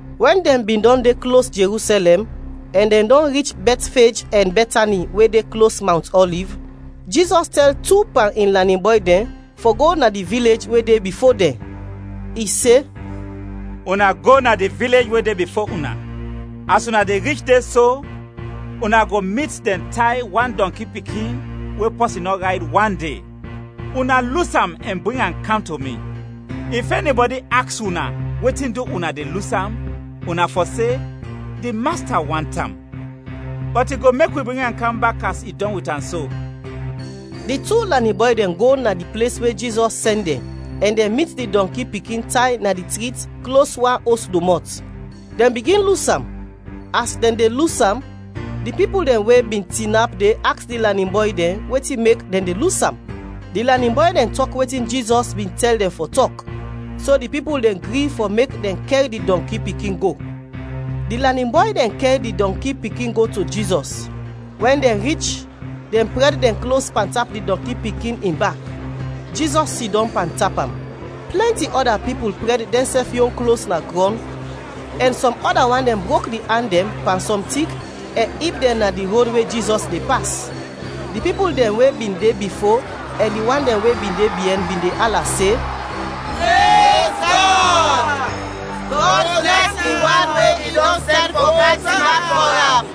Wɛn dɛn bin dɔn de klos Jerusɛlɛm, ɛn dɛn dɔn rich Bɛtfej ɛn Bɛtani we de klos Mawnt Ɔliv, Jizɔs tɛl tu pan in lanin bɔy dɛn fɔ go na di vilej we de bifo dɛn. I se, “Una go na di vilej we de bifo una. As una de rich de so, una go mit dɛn tay wan dɔnki pikin we pɔsin nɔ rayd wande. Una lus am ɛn bring am kam to mi. If ɛnibɔdi aks una wetin du una de lus am, una fɔ se, ‘Di Masta want am, bɔt i go mek wi bring am kam bak as i dɔn wit am so.’” Di tu lanin bɔy dɛn go na di ples we Jizɔs sɛn dɛn ɛn dɛn mit di dɔnki pikin tay na trit klos wan os domɔt. Dɛn bigin lus am, as dɛn de lus am, di pipul dɛn we bin tinap de aks di lanin bɔy dɛn wetin mek dɛn de lus am. Di lanin bɔy dɛn tɔk wetin Jizɔs bin tɛl dɛn fɔ tɔk, so di pipul dɛn gri fɔ mek dɛn kɛr di dɔnki pikin go. Di lanin bɔy dɛn kɛr di dɔnki pikin go to Jizɔs; wɛn dɛn rich, dɛn prɛd dɛn klos pantap di dɔnki pikin in bak, Jizɔs sidɔm pantap am. Plɛnti ɔda pipul prɛd dɛnsɛf yon klos na grɔn ɛn sɔm ɔda wan dɛn brok di an dɛn pan sɔm tik ɛn ib dɛn na di rod we Jizɔs de pas. Di pipul dɛn we bin de bifo ɛn di wan dɛn we bin de biɛn bin de ala se, “Prez Gɔd! Gɔd blɛs di wan we i dɔn sɛn fɔ kam tinap fɔ am!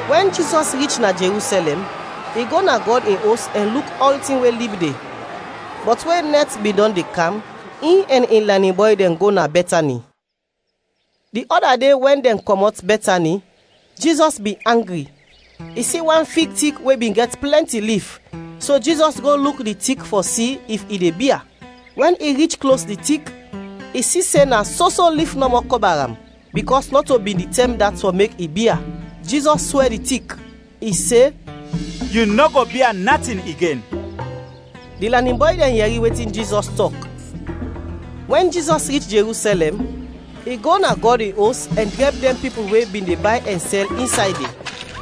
Wɛn Jizɔs rich na Jerusɛlɛm, i go na Gɔd in Os ɛn luk ɔltin we lib de. Bɔt we nɛt bin dɔn de kam, in ɛn in lanin bɔy dɛn go na Bɛtani. Di ɔda de wɛn dɛn kɔmɔt Bɛtani, Jizɔs bin angri. I si wan fig tik we bin gɛt plɛnti lif, so Jizɔs go luk di tik fɔ si if i de bia. Wɛn i rich klos di tik, i si se na soso lif nɔmɔ kɔba am, bikɔs nɔto bin di tɛm dat fɔ mek i bia. Jizɔs swɛ di tik, i se, “Yu nɔ go bia natin igen.” Di lanin bɔy dɛn yɛri wetin Jizɔs tɔk. Wɛn Jizɔs rich Jerusɛlɛm, i go na Gɔd in Os ɛn drɛb dɛn pipul we bin de bay ɛn sɛl insay de.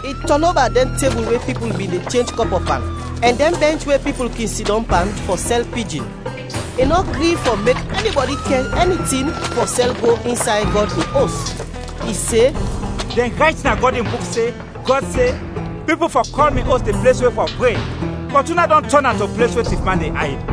I tɔn oba dɛn tebul we pipul bin de chenj kɔpɔ pan, ɛn dɛn bɛnch we pipul kin sidɔm pan fɔ sɛl pijin. I nɔ gri fɔ mek ɛnibɔdi kɛr ɛni tin fɔ sɛl go insay Gɔd in Os. I se, “Dɛn rayt na Gɔd in Buk se, Gɔd se, ‘Pipul fɔ kɔl mi Os di ples we fɔ pre’. Bɔt una dɔn tɔn am to ples we tifman de ayd!”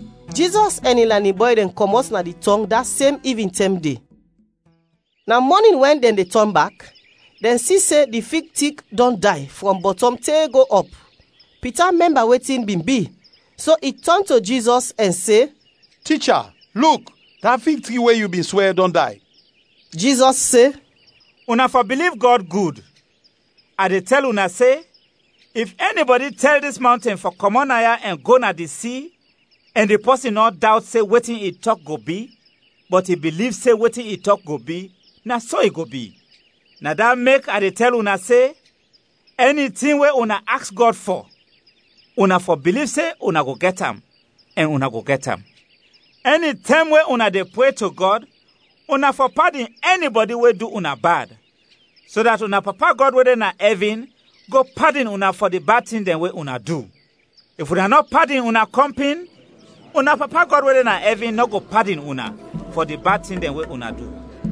Jizɔs ɛn in lanin bɔy dɛn kɔmɔt na di tɔng da sem ivintɛm de. Na mɔnin wɛn dɛn de tɔn bak, dɛn si se di fig tik dɔn day frɔm bɔtɔm te go ɔp. Pita mɛmba wetin bin bi, so i tɔn to Jizɔs ɛn se, “Ticha, luk, da fig tik we yu bin swɛ dɔn day!” Jizɔs se, “Una fɔ biliv Gɔd gud. A de tɛl una se, if ɛnibɔdi tɛl dis mawnten fɔ kɔmɔt naya ɛn go na di si, ɛn di pɔsin nɔ dawt se wetin i tɔk go bi, bɔt i biliv se wetin i tɔk go bi, na so i go bi. Na dat mek a de tɛl una se, ɛni tin we una aks Gɔd fɔ, una fɔ biliv se una go gɛt am ɛn una go gɛt am. Ɛnitɛm we una de pre to Gɔd, una fɔ padin ɛnibɔdi we du una bad, so dat una Papa Gɔd we de na ɛvin go padin una fɔ di bad tin dɛn we una du. [ If una nɔ padin una kɔmpin, una Papa Gɔd we de na ɛvin nɔ go padin una fɔ di bad tin dɛn we una du.]”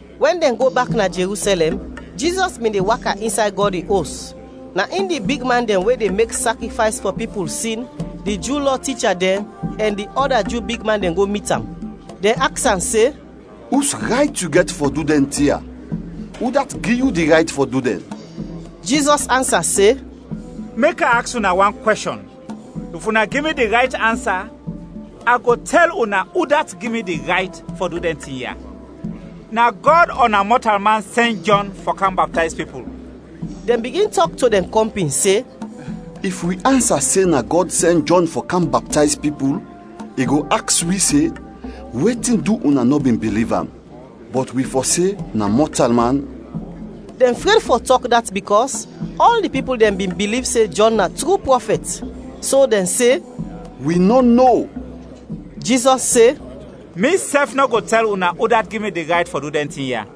Wɛn dɛn go bak na Jerusɛlɛm, Jizɔs bin de waka insay Gɔd in Os, na in di bigman dɛn we de mek sakrifays fɔ pipul sin, di Ju Lɔ ticha dɛn, ɛn di ɔda Ju bigman dɛn go mit am. Dɛn aks am se, “Us rayt yu gɛt fɔ du dɛn tin ya? Udat gi yu di rayt fɔ du dɛn?” Jizɔs ansa se, “Mek a aks una wan kwɛshɔn, if una gi mi di rayt ansa, a go tɛl una udat gi mi di rayt fɔ du dɛn tin ya. Na Gɔd ɔ na mɔtalman sɛn Jɔn fɔ kam baptayz pipul?” Dɛn bigin tɔk to dɛn kɔmpin se, “If wi ansa se na Gɔd sɛn Jɔn fɔ kam baptayz pipul, i go aks wi se, ‘Wetin du una nɔ bin biliv am?’ Bɔt wi fɔ se ‘Na mɔtalman...’” (dɛn fred fɔ tɔk dat bikɔs ɔl di pipul dɛn bin biliv se Jɔn na tru prɔfɛt.) So dɛn se, “Wi nɔ no!” Jizɔs se, “Misɛf nɔ go tɛl una udat gi mi di rayt fɔ du dɛn tin ya.”